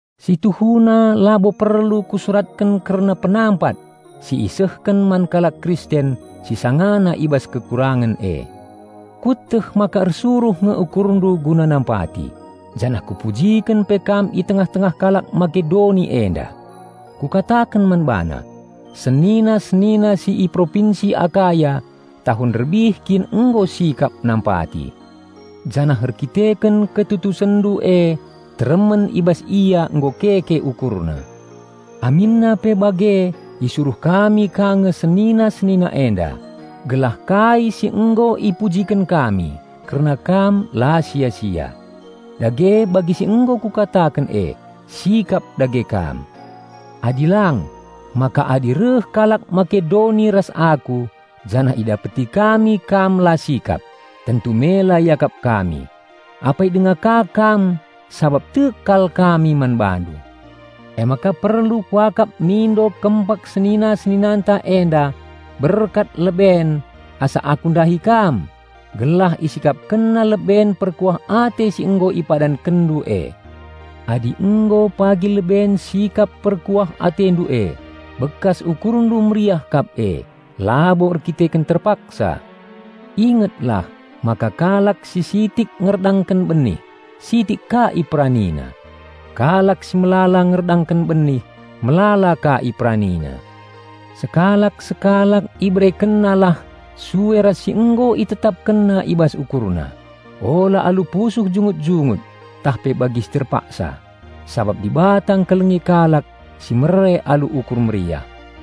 Si tuhuna labo perlu kusuratken kerna penampat si isehken man kalak Kristen si sangana i bas kekurangen e. Kueteh maka ersuruh nge ukurndu guna nampati, janah kupujiken pe kam i tengah-tengah kalak Makedoni enda. Kukataken man bana, "Senina-senina si i propinsi Akaya tahun nderbih kin nggo sikap nampati." Janah erkiteken ketutusenndu e teremen i bas ia nggo keke ukurna. Aminna pe bage isuruh kami ka nge senina-senina enda, gelah kai si nggo ipujiken kami kerna kam la sia-sia. Dage bagi si nggo kukataken e, sikap dage kam. Adi lang, maka adi reh kalak Makedoni ras aku janah idapeti kami kam la sikap, tentu mela iakap kami, apai denga ka kam -- sabap tek kal kami man bandu. Emaka perlu kuakap mindo kempak senina-seninanta enda berkat leben asa aku ndahi kam gelah isikapkenna leben perkuah ate si nggo ipadankenndu e. Adi nggo pagi leben sikap perkuah atendu e, bekas ukurndu meriah kap e, labo erkiteken terpaksa. Inget lah maka kalak si sitik ngerdangken benih, sitik ka iperanina; kalak si melala ngerdangken benih, melala ka iperanina. Sekalak-sekalak iberekennalah sue ras si nggo itetapkenna i bas ukurna; ula alu pusuh jungut-jungut tah pe bagi si terpaksa, sabap Dibata engkelengi kalak si mere alu ukur meriah.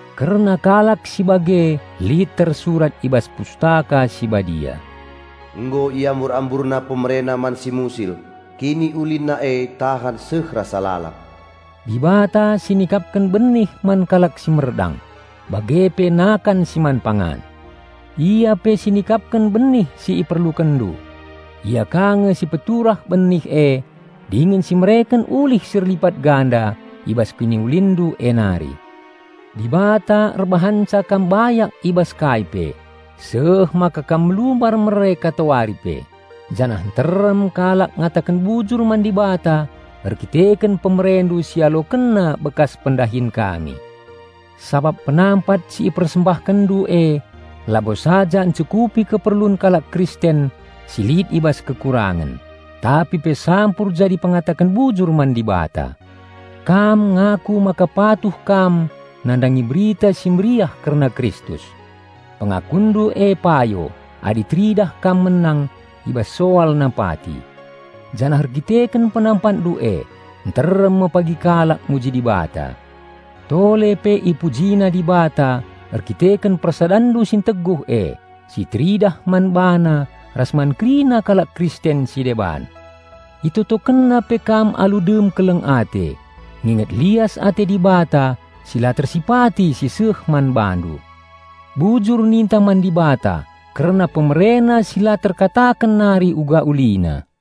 Kerna kalak si bage lit tersurat i bas Pustaka Si Badia, "Nggo iambur-amburna pemerena man si musil, kiniulinna e tahan seh rasa lalap." Dibata si nikapken benih man kalak si merdang bage pe nakan si man pangan. Ia pe si nikapken benih si iperlukenndu. Ia ka nge si peturah benih e dingen si mereken ulih si erlipat ganda i bas kiniulinndu e nari. Dibata erbahanca kam bayak i bas kai pe, seh maka kam melumbar mere katawari pe, janah nterem kalak ngataken bujur man Dibata erkiteken pemerendu si ialokenna bekas pendahin kami. Sabap penampat si ipersembahkenndu e labo saja encukupi keperlun kalak Kristen si lit i bas kekurangen, tapi pe sampur jadi pengataken bujur man Dibata. Kam ngaku maka patuh kam nandangi Berita Si Mehuli kerna Kristus. Pengakunndu e payo adi teridah kam menang i bas soal nampati. Janah erkiteken penampatndu e, nterem me pagi kalak muji Dibata. Tole pe ipujina Dibata erkiteken persadanndu si enteguh e, si teridah man bana ras man kerina kalak Kristen si deban. Itotokenna pe kam alu dem keleng ate, nginget lias ate Dibata si la tersipati si seh man bandu. Bujur ninta man Dibata kerna PemereNa si la terkataken nari uga ulina.